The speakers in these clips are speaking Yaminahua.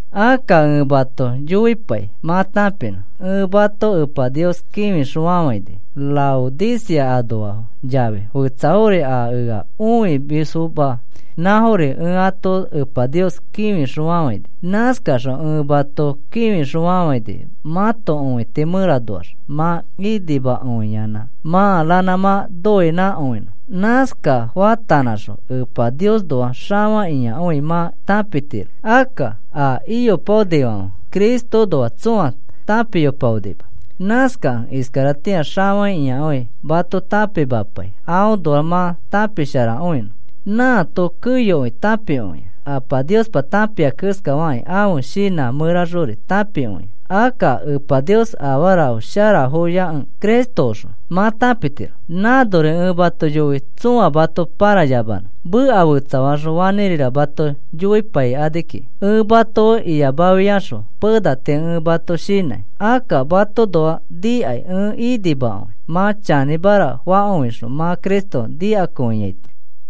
Akka ẽ mato yoipai mã tãpinõ, ẽ mato Epa Nios kĩfixõfafãini. Laodicea anoafo yafi fetsafori a ea õimisfoma nãfori ẽ ato Epa Nios kĩfixõfafãini. Nãskaxõ ẽ mato kĩfixõfafãini mãto õiti mẽranoax mã inimakõiyanã, mã ranã mã nõinãkõinõ. Nãska faatanãxõ Epa Niosnoa xafakĩakõi mã tãpitiro, akka a iyopaonifãfe Cristoõnoa tsõa tãpiyopaonima. Nãskakẽ iskaratĩa xafakĩakõi mato tãpimapai aõnoa mã tãpisharakõinõ. Nãato keyokõi tãpikõia, Apa Niospa tãpia keskafakĩ ãfe shinã mẽraxori tãpikõia. Akka Epa Nios afarafo sharafoyakẽ, Cristoõxõ mã tãpitiro. Nãnori ẽ mato yoi, tsõa mato pãrayamanõ, meka fetsafaxõ fanĩrira mato yoipaikani kiki. Ẽ mato fe iyamafiaxõ pena tii ẽ mato shinãi. Akka matoõnoa nikai ẽ inimakõi, mã chanĩmara fakõixõ mã Cristo nikakõiaito.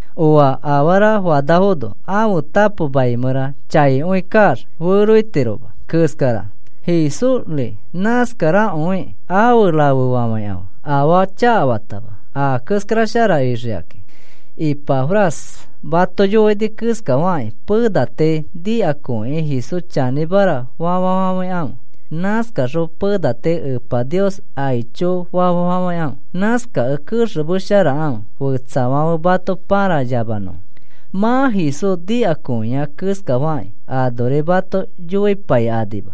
Oa afara fanafono ãfe tapo mai mẽra chaikõi kaax feroitiroma keskara, Jesúsri nãskarakõikĩ, afe rafefafãikãfe afaa chakafatama a keskara shara ixikakĩ. Ipafras mato yoini keskafakĩ pena tii nikakõikĩ Jesús chanĩmara fafafafãikãfe. Nãskaxõ pena tii Epa Nios aichofa fafafãikãfe. Nãskakẽ kexemesharakãfe, fetsafãfe mato pãrayamanõfo. Mã Jesús nikakõiai keskafakĩ anori mato yoipaikanima.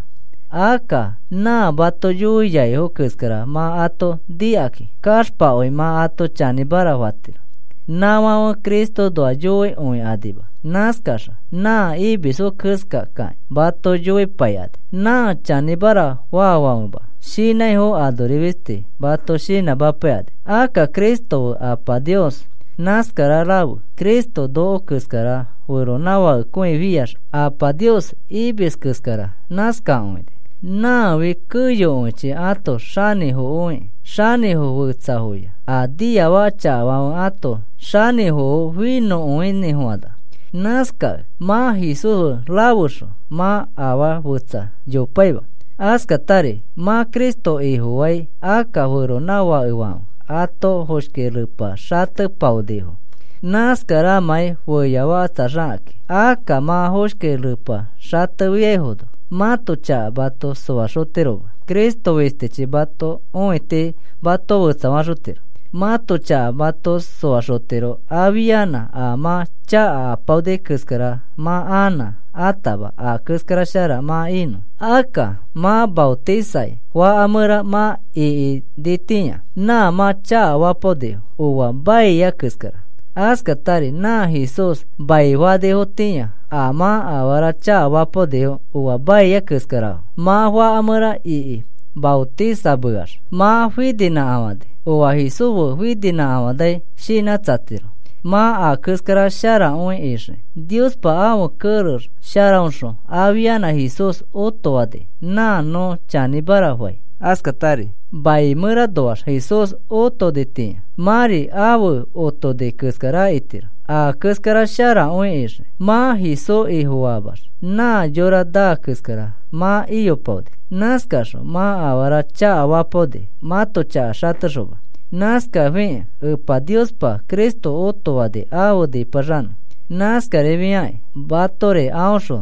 Akka nã mato yoiaifo keskara mã ato nikakĩ kaxpakõi mã ato chanĩmara fatiro. Nãfãfe Cristoõnoa yoikõikanima, nãskaxõ nã imisfo keskakakĩ mato yoipaikani. Nã chanĩmara faafãfema shinãifo anori fisti mato shinãmapaikani. Akka Cristo fe Apa Nios nãskara rafe, Cristo noko keskara feronãfakekõifiax Apa Nios imis keskara nã nãskakõini. Nãfi keyokõichi ãto xanĩfokõiki, xanĩfo fetsafoya, a niafaka chakafãfe ãto xanĩfofo finõkõinĩfofãna. Nãskakẽ mã Jesús fe rafexõ mã afaa fetsa yopaima. Askatari mã Cristo Ifofai akka feronãfakefãfe ãto foshki repa xatepaonifo, nãskaramãi feyafakatsaxakakĩ. Akka mã foshki repa xatefiafono mãto chaka mato soaxotiroma. Cristo fistichi mãto õiti mato fetsafaxotiro, mãto chaka mato soaxotiro afianã a mã chaka apaoni keskara mã anã atama a keskara shara mã inõ. Akka mã maotisai faka mẽra mã ikinitĩa, nã mã chakafapaonifo oa maia keskara, askatari nã Jesús maifanifotĩa a mã afara chakafapaonifo oa maia keskarafo. Mã faka mẽra iki maotisameax mã fininãkafãni oa Jesús fe fininãkafani shinãtsatiro mã a keskara sharakõi ixiki. Niospa ãfe kerex sharaõxõ afianã Jesús otofani nã nõ chanĩmara fai. Askatari mai mẽranoax Jesús otonitĩa, mãri afe otoni keskara itiro, a keskara sharakõi ixiki. Mã Jesús Ifofaamax nã yora naa keskara mã iyopaoni. Nãskaxõ mã afara chakafapaoni mãto chaka xatexoma. Nãskafikẽ Epa Niospa Cristo otofani afe nipaxanõ. Nãskarifiakĩ matori aõxõ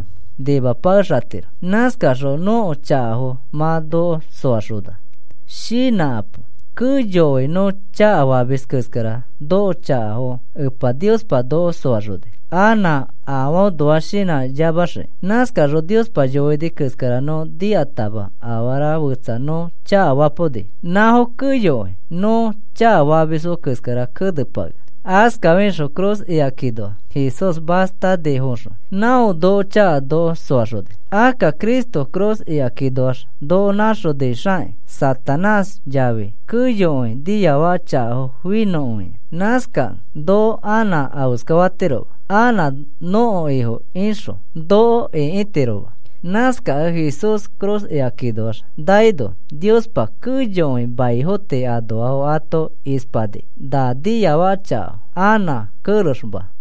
nimapakexatiro, nãskaxõ nõko chakafo mã noko soaxona. Shinãkapo. Keyokõi nõ chakafamis keskara nõko chakafo Epa Niospa noko soaxoni, anã afoõnoa shinãyamaxii. Nãskano Niospa yoini keskara nõ nikatama afara fetsa nõ chakafapaoni. Nãfo keyokõi nõ chakafamisfo keskara kenepakea. Askafixõ ifi cruz ikakinoa Jesús mastanifoxõ não nõko chaka noko soaxoni. Akka Cristo ifi cruz ikakinoax noko nãxonixakĩ, Satanás yafi keyokõi niafaka chakafo finõkõia. Nãskakẽ noko anã afeskafatiroma, anã nõko ifo ixõ noko ĩkitirofoma. Nãskakẽ Jesús ifi cruz ikakinoax naino Niospa keyokõi maifo tii anoafo ato ispani na niafaka chakafo anã kerexfoma.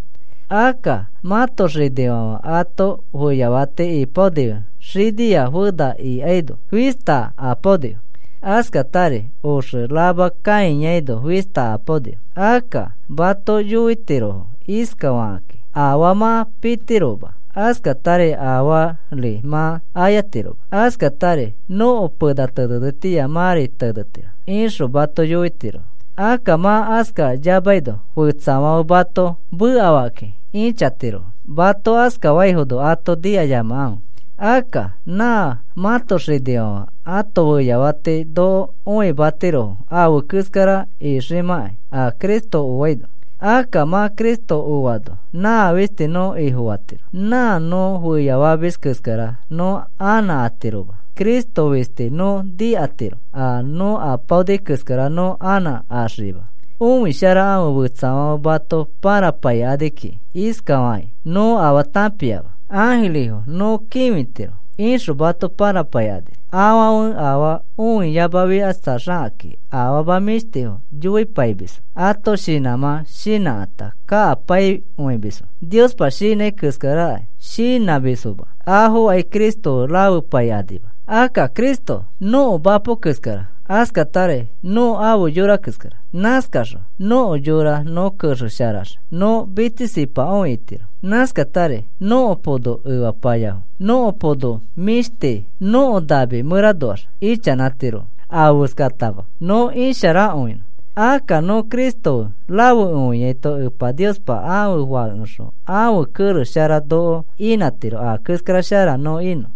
Akka mãto xinifãfe ãto feyafati ipaoni xinia fena ikaino fista apaonifo. Askatari oxe rama kãiyaino fista apaonifo. Akka mato yoitirofo iskafakakĩ: “Afaa mã pitiroma askatari afaari mã ayatiroma. Askatari nõko pena tenetitĩa mãri tenetiro,” ixõ mato yoitirofo. Akka mã askayamaino fetsafãfe mato mekafakĩ ĩchatirofo. Mato askafaifono ato nikayamakãfe. Akka nã mãto xinifãfe ãto feyafati noko õimatirofo afe keskara iximãkai a Cristo oaino. Akka mã Cristo oano nã fisti nõ Ifofatiro. Nã nõ feyafamis keskara nõ anã atiroma. Cristo fisti nõ nikatiro a nõ ayopaoni keskara nõ anã axikima. Õisharakãfe fetsafãfe mato pãrapaikani kiki iskafakakĩ: “Nõ afaa tãpiama. Ãjirifo nõ kĩfitiro,” ixõ mato pãrapaikani. Afãfe afaa õiyamafikatsaxakakĩ afama mĩshtifo yoipaimisfo. Ãto shinãmã shinãkata kakapaikõimisfo, Niospa shinãi keskarakai shinãmisfoma. Afokai Cristo fe rafepaikanima. Akka Cristo nõko mapo keskara askatari nõ ãfe yora keskara. Nãskaxõ nõko yora nõ kexesharax nõ mitsisipakõi itiro. Nãskatari nõko pono efapayafo, nõko pono mĩshti, nõko nami mẽranoax ichanãtirofo. Afeskatama nõ isharakõinõ. Akka nõ Cristo fe rafekõiaito Epa Niospa ãfe Fãkeoxõ ãfe kerex shara noko inãtiro a keskara shara nõ inõ.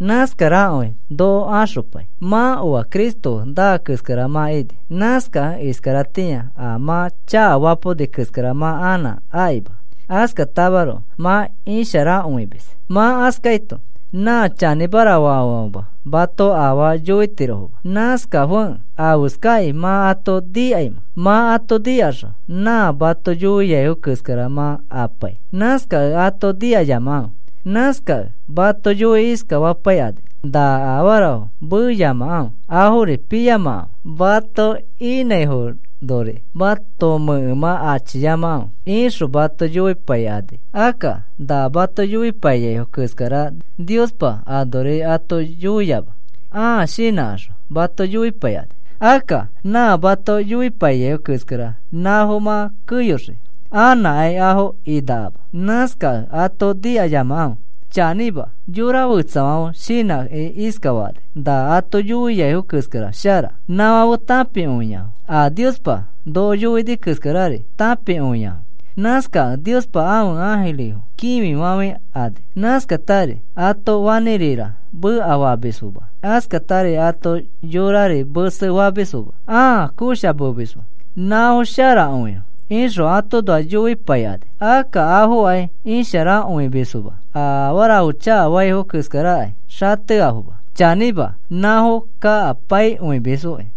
Nãskarakõi noko axopai. Mã oa Cristo fe naa keskara mã ini. Nãskakẽ iskaratĩa a mã chakafapaoni keskara mã anã akima. Askatamaroko mã isharakõimis. Mã askaito nã chanĩmara faafãfema mato afaa yoitirofoma. Nãskafekẽ, ¿afeskakĩ mã ato nikaimẽ, mã ato nikaxõ nã mato yoiaifo keskara ma apai? Nãskakẽ ato nikayamakãfe. Nãskakẽ mato yoiki iskafapaikani: “Na afarafo meyamakãfe, afori piyamakãfe, mato inãifonori mãto mẽkemã achiyamakãfe,” ixõ mato yoipaikani. Akka na mato yoipaiyaifo keskara Niospa anori ato yoiama. Ãa shinãkaxõ mato yoipaikani. Akka nã mato yoipaiyaifo keskara nãfo mã keyoxii, anãkai afo inakama. Nãskakẽ ato nikayamakãfe. Chanĩma, yora fetsafãfe shinãkĩ iskafakani. Na ato yoiaifo keskara shara, nafãfe tãpikõiafo, a Niospa noko yoini keskarari tãpikõiafo. Nãskakẽ Niospa ãfe ãjirifo kĩfifafãikani. Nãskakatari ato fanĩrira mekafamisfoma, askatari ãto yorari mese famisfoma ãa koshamemisfo. “Nafo sharakõifo,” ixõ atoõnoa yoipaikani. Akka afokai isharakõimisfoma. A afarafo chakafaifo keskarakai xateafoma, chanĩma nãfo kakapaikõimisfoki.